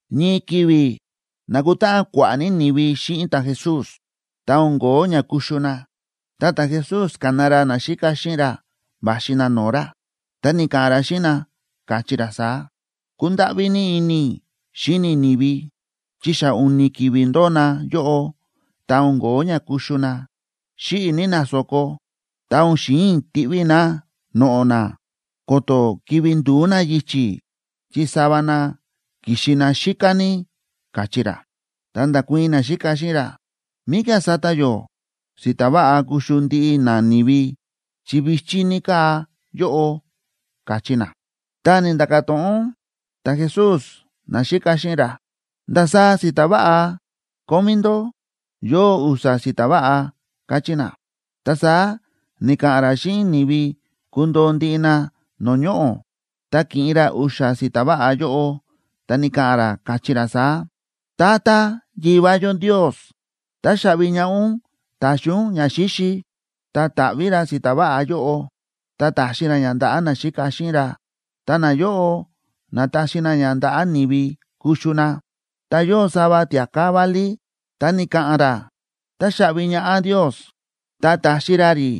Ñii ki̱vi̱ na̱kutáꞌan kua̱ꞌa̱ ní ni̱vi xíꞌin ta̱Jesús. Ta o̱n ko̱ó ña kuxu na, ta ta̱Jesús ka̱na ra naxíka xíꞌin ra va̱xi na no̱o̱ ra, ta ni̱ka̱ꞌa̱n ra xíꞌin na, káchí ra saá: ―Kúndáꞌví ní ini i̱ xíni i̱ ni̱vi, chi xa u̱ni̱ ki̱vi̱ ndóo na yóꞌo ta o̱n ko̱ó ña kuxu na. Xíꞌi̱ ní na so̱ko, ta o̱n xi̱in i̱ tiꞌví i̱ na noꞌo̱ na ko̱to̱ kivi̱ ndu̱ú na yichi̱, chi sava na ki̱xi na xíká ní ―káchí ra. Ta nda̱kuii̱n naxíka xíꞌin ra: ―¿Míkía̱ sata yó si̱ta̱ váꞌa kuxu ndiꞌi nani̱vi, chi vi̱chí ní káa yóꞌo? ―káchí na. Ta ni̱nda̱ka̱ to̱ꞌon ta̱Jesús naxíka xíꞌin ra: ―¿Ndasaá si̱ta̱ váꞌa kómí ndó? ―Yóo u̱xa̱ si̱ta̱ váꞌa ―káchí na. Ta saá ni̱ka̱ꞌa̱n ra xíꞌin ni̱vi kundoo ndiꞌi na no̱o̱ ñoꞌo̱. Ta ki̱ꞌin ra u̱xa̱ si̱ta̱ váꞌa yóꞌo, ta ni̱ka̱ꞌa̱n ra, káchí ra saá: ―Tata Yivá yó Ndios, táxaꞌvi ñaꞌá ún ta̱xi ún ñaxíxi. Ta ta̱ꞌví ra si̱ta̱ váꞌa yóꞌo, ta ta̱xi ra ña ndaꞌa̱ naxíka xíꞌin ra, ta nayóꞌo na̱taxi na ña ndaꞌa̱ ni̱vi kuxu na. Ta yóo sava tia̱ká válí, ta ni̱ka̱ꞌa̱n ra táxaꞌvi ñaꞌá Ndios, ta ta̱xi ra rí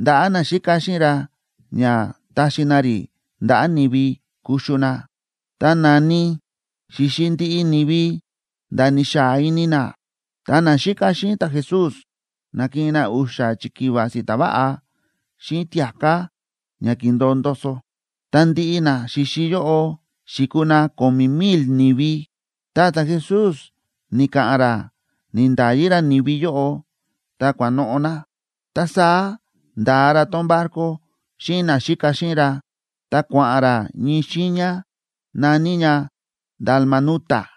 ndaꞌa̱ naxíka xíꞌin ra ña taxi na rí ndaꞌa̱ ni̱vi kuxu na. Ta na̱ni xi̱xi ndiꞌi ni̱vi nda̱ ni̱xaa ini na. Ta naxíka xíꞌin ta̱Jesús na̱kiꞌin na u̱xa̱ chikiva si̱ta̱ váꞌa xíꞌin tia̱ká ña ki̱ndo̱o ndoso. Ta ndiꞌi na xi̱xi yóꞌo xi̱kuu na ko̱mi̱ mil ni̱vi. Ta ta̱Jesús ni̱ka̱ꞌa̱n ra ni̱nda̱yi ra ni̱vi yóꞌo, ta kua̱noꞌo̱ na. Ta saá nda̱a ra tón barco xíꞌin naxíka xíꞌin ra, ta kua̱ꞌa̱n ra ñii xiiña na̱ní ña Dalmanuta.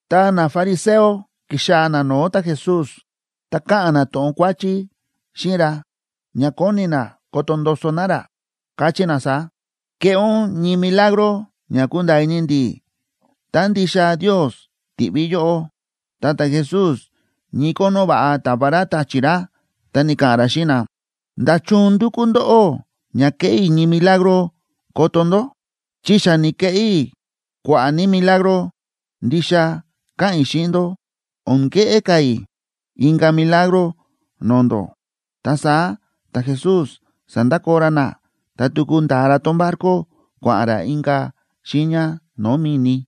Ta nafariseo ki̱xaa̱ na no̱o̱ ta̱Jesús. Ta káꞌa̱n na to̱ꞌon kuáchí xíꞌin ra ña kóni na koto ndoso na ra, káchí na saá: ―Keꞌé ún ñii milagro ña kunda̱a̱ ini ndi̱ tá ndixa Ndios ti̱ꞌví yóꞌó. Ta ta̱Jesús ñii kónó va̱ꞌa ta̱va ra ta̱chi̱ ra, ta ni̱ka̱ꞌa̱n ra xíꞌin na: ―¿Nda̱chun ndúkú ndóꞌó ña keꞌé i̱ ñii milagro koto ndó?, chi xa ni̱keꞌé i̱ kua̱ꞌa̱ ní milagro. Ndixa káꞌa̱n i̱ xíꞌin ndó, o̱n keꞌé ka̱ i̱ inka̱ milagro no̱o̱ ndó. Ta saá ta̱Jesús sa̱ndakoo ra na, ta tuku nda̱a ra tón barco, kua̱ꞌa̱n ra inka̱ xiiña no̱o̱ mi̱ni.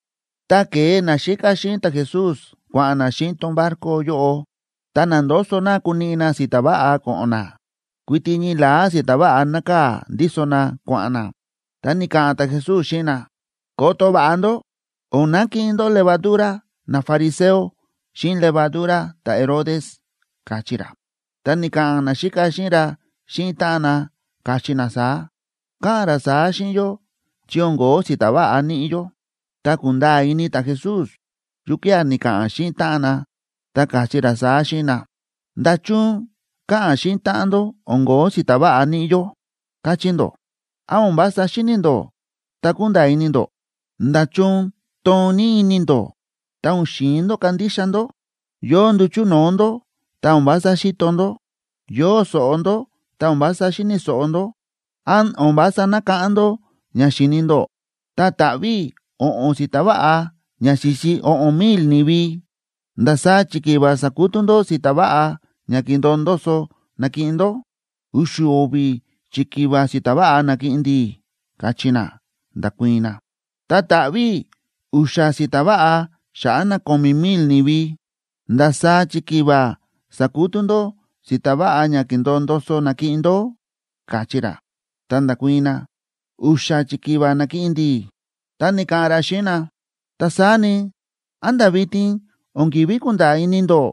Ta ke̱e naxíka xíꞌin ta̱Jesús kua̱ꞌa̱n na xíꞌin tón barco yóꞌo, ta na̱ndoso na kuniꞌi na si̱ta̱ váꞌa ko̱ꞌo̱n na, kuiti ñii la̱á si̱ta̱ váꞌa nákaa̱ ndíso na kua̱ꞌa̱n na. Ta ni̱ka̱ꞌa̱n ta̱Jesús xíꞌin na: ―Koto va̱ꞌa ndó, o̱n nakiꞌin ndó levaduraa nafariseo, xíꞌin levadura ta̱Herodes ―káchí ra. Ta ni̱ka̱ꞌa̱n naxíka xíꞌin ra xíꞌin táꞌan na, káchí na saá: ―Káꞌa̱n ra saá xíꞌin yó chi o̱n ko̱ó si̱ta̱ váꞌa níꞌi yó. Ta ku̱nda̱a̱ ini ta̱Jesús yukía̱ ni̱ka̱ꞌa̱n xíꞌin táꞌan na, ta káchí ra saá xíꞌin na: ―¿Nda̱chun káꞌa̱n xíꞌin táꞌan ndó: “O̱n ko̱ó si̱ta̱ váꞌa níꞌi yó”, káchí ndó? ¿Án o̱n vása xíni̱ ndó, ta kúnda̱a̱ ini ndó? ¿Nda̱chun toon ní ini ndó ta o̱n xi̱in ndó kandixa ndó? Yóo nduchu̱ no̱o̱ ndó ta o̱n vása xíto ndó. Yóo so̱ꞌo ndó ta o̱n vása xíni̱ so̱ꞌo ndó. ¿Án o̱n vása nákáꞌán ndó ña xi̱ni ndó? Tá ta̱ꞌví i̱ o̱ꞌo̱n si̱ta̱ váꞌa ña xi̱xi o̱ꞌo̱n mil ni̱vi, ¿ndasaá chikiva sa̱kutú ndó si̱ta̱ váꞌa ña ki̱ndo̱o ndoso na̱kiꞌin ndó? ―U̱xu̱ o̱vi̱ chikiva si̱ta̱ váꞌa na̱kiꞌin ndi̱ ―káchí na, nda̱kuii̱n na. ―Tá ta̱ꞌví i̱ u̱xa̱ si̱ta̱ váꞌa xa̱ꞌa̱ na ko̱mi̱ mil ni̱vi, ¿ndasaá chikiva sa̱kutú ndó si̱ta̱ váꞌa ña ki̱ndo̱o ndoso na̱kiꞌin ndó? ―káchí ra. Ta nda̱kuii̱n na: ―U̱xa̱ chikiva na̱kiꞌin ndi̱. Ta ni̱ka̱ꞌa̱n ra xíꞌin na: ―Ta saá ni, ¿án nda̱ vitin o̱n ki̱ví kunda̱a̱ ini ndó?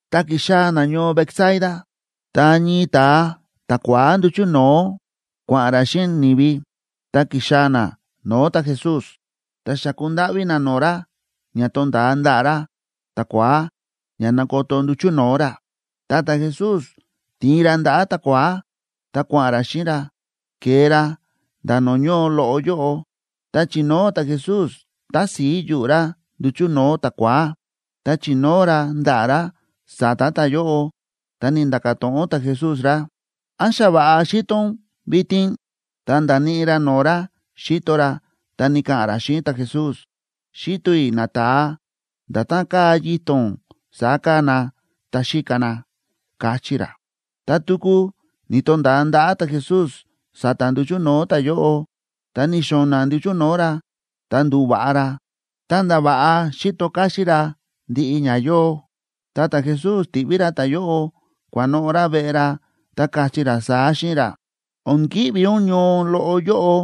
Ta ki̱xaa̱ na ñoo Betsaida, ta ñii ta̱a ta̱kua̱á nduchu̱ no̱o̱ kua̱ꞌa̱n ra xíꞌin ni̱vi, ta ki̱xaa̱ na no̱o̱ ta̱Jesús, ta xa̱ku ndáꞌví na no̱o̱ ra ña tonda̱a ndaꞌa̱ ra ta̱kua̱á ña nakoto nduchu̱ no̱o̱ ra. Ta ta̱Jesús ti̱in ra ndaꞌa̱ ta̱kua̱á ta kua̱ꞌa̱n ra xíꞌin ra, ke̱e ra nda̱ no̱o̱ ñoo loꞌo yóꞌo. Tá chi̱nóo ta̱Jesús tási̱i yuꞌu̱ ra nduchu̱ no̱o̱ ta̱kua̱á, ta chi̱nóo ra ndaꞌa̱ ra sa̱ta̱ ta̱yóꞌo, ta ni̱nda̱ka̱ to̱ꞌon ta̱Jesús ra: ―¿Án xa va̱ꞌa xíto ún vitin? Ta nda̱níꞌi ra no̱o̱ ra xíto ra, ta ni̱ka̱ꞌa̱n ra xíꞌin ta̱Jesús: ―Xíto i̱ nata̱a, nda̱tán káa yito̱n saá káa na, ta xíka na ―káchí ra. Ta tuku ni̱to̱nda̱a ndaꞌa̱ ta̱Jesús sa̱ta̱ nduchu̱ no̱o̱ ta̱yóꞌo. Ta ni̱xo̱na̱ nduchu̱ no̱o̱ ra, ta ndu̱va̱ꞌa ra, ta̱nda̱ va̱ꞌa xíto káxín ra ndiꞌi ña yóo. Ta ta̱Jesús ti̱ꞌví ra ta̱yóꞌo kua̱noꞌo̱ ra veꞌe ra, ta káchí ra saá xíꞌin ra: ―O̱n ki̱ꞌvi ún ñoo loꞌo yóꞌo,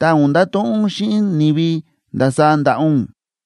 ta o̱n ndato̱ꞌon ún xíꞌin ni̱vi ndasaá nda̱ꞌa ún.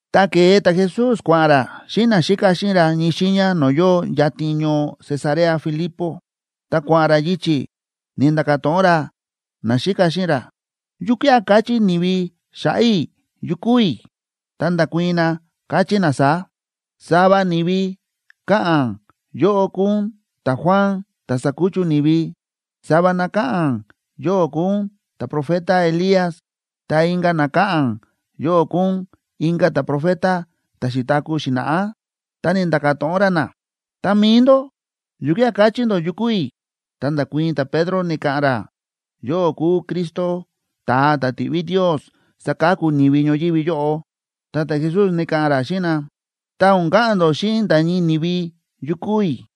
Ta ke̱e ta̱Jesús kua̱ꞌa̱n ra xíꞌin naxíka xíꞌin ra ñii xiiña no̱o̱ yóo yatin ñoo Cesarea Filipo. Tá kua̱ꞌa̱n ra yichi̱, ni̱nda̱ka̱ to̱ꞌon ra naxíka xíꞌin ra: ―¿Yukía̱ káchí ni̱vi xa̱ꞌa̱ i̱ yu kúu i̱? Ta nda̱kuii̱n na, káchí na saá: ―Sava ni̱vi káꞌa̱n yóꞌó kúu ún ta̱Juan ta̱ sa̱kuchu ni̱vi. Sava na káꞌa̱n yóꞌó kúu ún ta̱profeta Elías, ta inka̱ na káꞌa̱n yóꞌó kúu ún inka̱ ta̱profeta ta̱ xi̱taku̱ xi̱na̱ꞌá. Ta ni̱nda̱ka̱ to̱ꞌon ra na: ―Ta mi̱i ndó, ¿yukía̱ káchí ndó yu kúu i̱? Ta nda̱kuii̱n ta̱Pedro, ni̱ka̱ꞌa̱n ra: ―Yóꞌó kúu Cristo, ta̱a ta̱ ti̱ꞌví Ndios saka̱ku ni̱vi ñoyívi yóꞌo. Ta ta̱Jesús ni̱ka̱ꞌa̱n ra xíꞌin na: ―Ta o̱n ka̱ꞌa̱n ndó xíꞌin nda̱ ñii ni̱vi yu kúu i̱.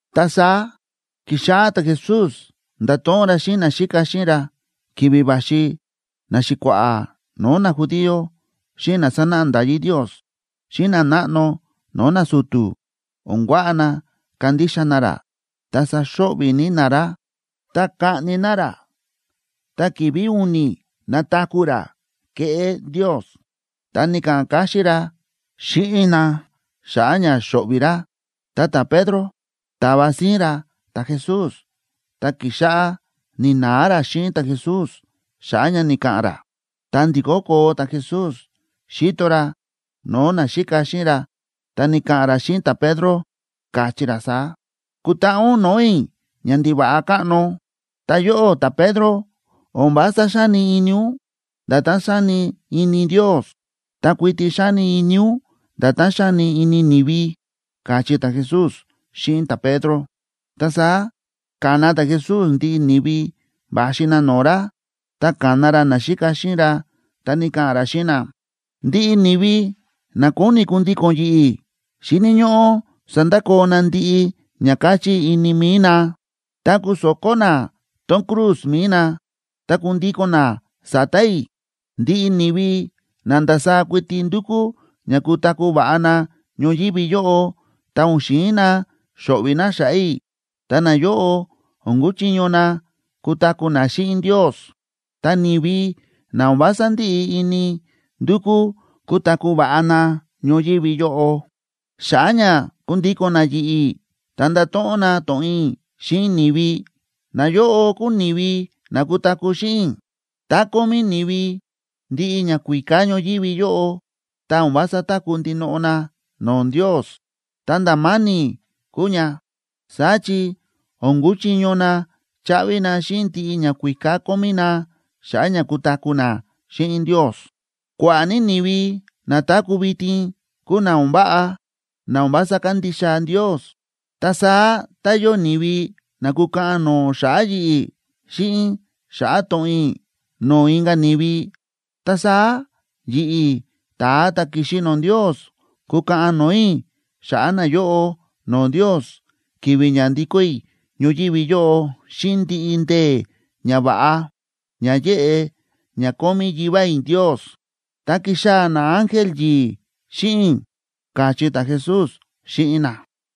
Ta saá ki̱xáꞌá ta̱Jesús ndáto̱ꞌon ra xíꞌin naxíka xíꞌin ra ki̱vi̱ va̱xi naxi̱kua̱ꞌa̱ no̱o̱ najudío, xíꞌin na sánáꞌa nda̱yí Ndios xíꞌin nanáꞌno no̱o̱ nasu̱tu̱ o̱n kuaꞌa na kandixa na ra ta saxo̱ꞌvi̱ ní na ra. Ta kaꞌni na ra, ta ki̱vi̱ u̱ni̱ nataku̱ ra, keꞌé Ndios. Ta ni̱ka̱ꞌa̱n káxín ra xíꞌin na xa̱ꞌa̱ ña xo̱ꞌvi̱ ra. Ta ta̱Pedro ta̱va síín ra ta̱Jesús, ta ki̱xáꞌá ni̱na̱a ra xíꞌin ta̱Jesús xa̱ꞌa̱ ña ni̱ka̱ꞌa̱n ra. Ta ndi̱kó koo ta̱Jesús xíto ra no̱o̱ naxíka xíꞌin ra, ta ni̱ka̱ꞌa̱n ra xíꞌin ta̱Pedro, káchí ra saá: ―¡Kutaꞌa ún no̱o̱ i̱, ñandiva̱ꞌa káꞌno! Ta yóꞌó ta̱Pedro o̱n vása xáni ini ún nda̱tán xáni ini Ndios. Ta kuiti xáni ini ún nda̱tán xáni ini ni̱vi ―káchí ta̱Jesús xíꞌin ta̱Pedro. Ta saá ka̱na ta̱Jesús ndiꞌi ni̱vi va̱xi na no̱o̱ ra, ta ka̱na ra naxíka xíꞌin ra, ta ni̱ka̱ꞌa̱n ra xíꞌin na: ―Ndiꞌi ni̱vi na kóni kundíko̱n yi̱ꞌi̱ xíni̱ ñóꞌó sandakoo na ndiꞌi ña káchí ini mi̱i na, ta kuso̱kó na tón cruz mi̱i nab ta kundíko̱n na sa̱ta̱ i̱. Ndiꞌi ni̱vi na ndasaá kuiti ndúkú ña kutaku̱ va̱ꞌa na ñoyívi yóꞌo, ta o̱n xi̱in na xo̱ꞌvi̱ na xa̱ꞌa̱ i̱, ta nayóꞌo o̱n kuchiño na kutaku̱ na xíꞌin Ndios. Ta ni̱vi na o̱n vása ndíꞌi ini ndukú kutaku̱ va̱ꞌa na ñoyívi yóꞌo, xa̱ꞌa̱ ña kundíko̱n na yi̱ꞌi̱ ta ndato̱ꞌon na to̱ꞌon i̱ xíꞌin ni̱vi, nayóꞌo kúu ni̱vi na kutaku̱ xíꞌin i̱. Tá kómí ni̱vi ndiꞌi ñakuíká ñoyívi yóꞌo, ta o̱n vása táku̱ ndinoꞌo na no̱o̱ Ndios, ta nda̱ ma̱ni̱ kúu ña. Saá chi o̱n kuchiño na chaꞌvi na xíꞌin ndiꞌi ñakuíká kómí na xa̱ꞌa̱ ña kutaku̱ na xíꞌin Ndios. Kua̱ꞌa̱ ní ni̱vi na táku̱ vitin kúu na o̱n váꞌa, na o̱n vása kándixa Ndios. Ta saá tá yóo ni̱vi na kúkaꞌan no̱o̱ xa̱ꞌa̱ yi̱ꞌi̱ xíꞌin xa̱ꞌa̱ to̱ꞌon i̱ no̱o̱ inka̱ ni̱vi, ta saá yi̱ꞌi̱, ta̱a ta̱ ki̱xi no̱o̱ Ndios, kukaꞌan no̱o̱ i̱ xa̱ꞌa̱ nayóꞌo no̱o̱ Ndios ki̱vi̱ ña ndikó i̱ ñoyívi yóꞌo xíꞌin ndiꞌi ndee̱ ñava̱ꞌa ña yéꞌe ña kómí Yivá i̱ Ndios, ta kixaa̱ naángel yi̱i̱ xíꞌin i̱ ―káchí ta̱Jesús xíꞌin na.